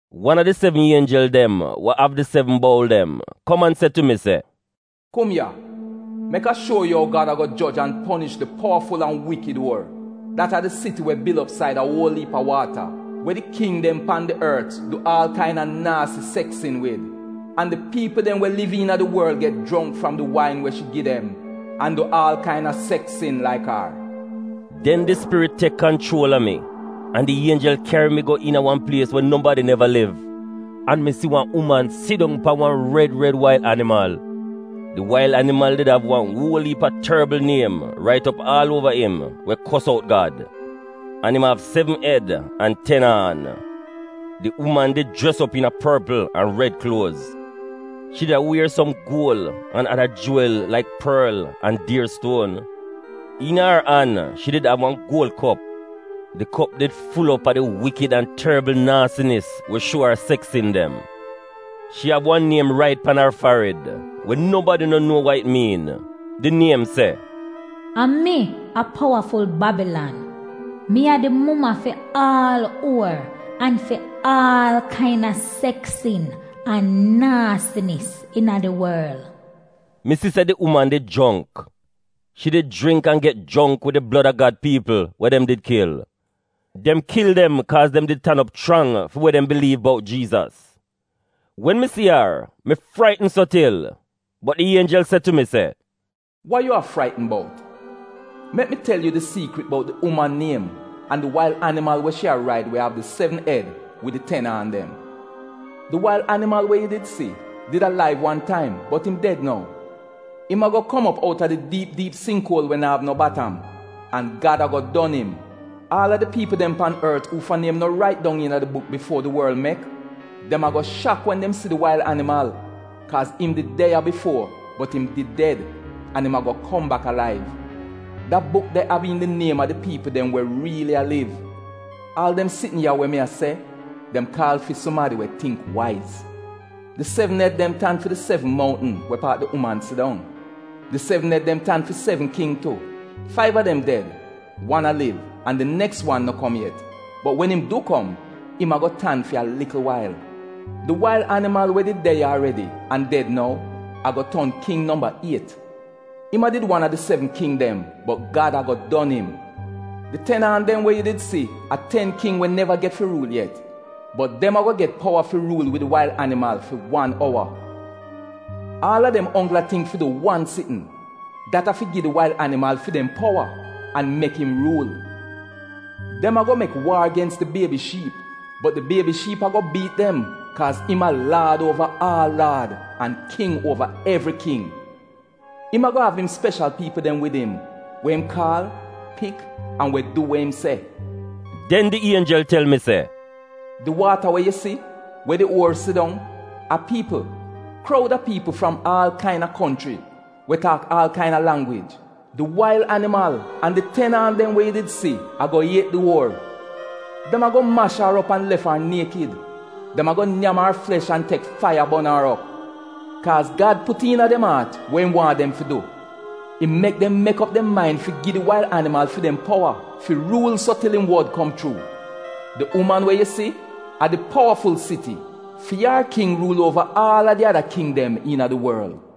Wan a di sevn ienjel dem we av di sevn boul dem kom an se tu mi, “Kum ya! Mek a shuo yu ou Gad ago joj an ponish di powaful an wikid uor — dat a di siti we bil op saida uol iip a waata, we di king dem pan di ort du aal kaina naasi seks sin wid, an di piipl dem we liv iina di worl get jongk fram di wain we shi gi dem an du aal kaina seks sin laik ar.” Den di Spirit tek kanchuol a mi, an di ienjel kyari mi go iina wan plies we nobadi neva liv, an mi si wan uman sidong pan wan red red wail animal. Di wail animal did av wan uol iip a torbl niem rait op aal uova im we kos out Gad. An im av sevn ed an ten aan. Di uman did jres op iina porpl an red kluoz. Shi did a wier som guol an ada juwil laik porl an dier stuon. Iina ar an shi did av wan guol kop. Di kop did fuul op a di wikid an torbl naasinis we shuo aaf ar seks sin dem. Shi av wan niem rait pan ar farid we nobadi no nuo wa it miin. Di niem se: A MI A POWAFUL BABILAN. MI A DI MUMA FI AAL UOR AN FI AAL KAINA SEKS SIN AN NAASINIS IINA DI WORL. Mi si se di uman did jongk. Shi did jringk an get jongk wid Gad piipl dem blod we dem did kil. Dem kil dem kaaz dem did tan op chrang fi wa dem biliiv bout Jiizas. Wen mi si ar, mi fraitn so til. Bot di ienjel se tu mi se: “Wa yu a fraitn bout? Mek mi tel yu di siikrit bout di uman niem an di wail animal we shi a raid we av di sevn ed wid di ten aan dem. Di wail animal we yu si we de ya bifuo, bot im did get kil. Im ago kom op outa di diip diip singk uol we na'av no batam, an Gad ago don im. Aal a di piipl dem pan ort uufa niem no rait dong iina di buk bifuo di worl mek, dem a go shak wen dem si di wail animal, kaaz im did de ya bifuo, bot im did ded, an im ago kom bak alaiv. Da buk de av iin di niem a di piipl dem we riili a liv. (Aal wa mi a se, dem sitn ya kaal fi sumadi we kyan tingk waiz). Di sevn ed dem tan fi di sevn mountn we paat di uman sidong. Di sevn ed dem tan fi sevn king tu. Faiv a dem ded, wan a liv, an di neks wan no kom yet, bot wen im du kom, im ago tan fi wan likl wail. Di wail animal we did de ya aredi, an ded nou, ago ton king nomba iet. Im a did wan a di sevn king dem, bot Gad ago don im. Di ten aan dem we yu did si a ten king we neva get fi ruul yet, bot dem ago get powa fi ruul wid di wail animal fi wan owa. Aal a dem onggl a tingk fi du wan sitn, dat a fi gi di wail animal fi dem powa an mek im ruul. Dem ago mek waar gens di Biebi Shiip, bot di Biebi Shiip ago biit dem kaaz im a Laad uova aal laad an King uova evri king — Im ago av im speshal piipl dem wid im, we im kaal, pik, an we du we im se. Den di ienjel tel mi se, “Di waata we yu si, (we di uor sidong), a piipl — kroud a piipl fram aal kaina konchri we taak aal kaina langwij Di wail animal an di ten aan dem we yu did si ago iet di uor. Dem ago mash ar op an lef ar niekid. Dem ago nyam ar flesh an tek faiya bon ar op. Kaaz Gad put iina dem aat we im waahn dem fi du. Im mek dem mek op dem main fi gi di wail animal fi dem powa fi ruul so til im wod kom chuu. Di uman we yu si a di powaful siti. Fi ar king ruul uova aal a di ada king dem iina di worl.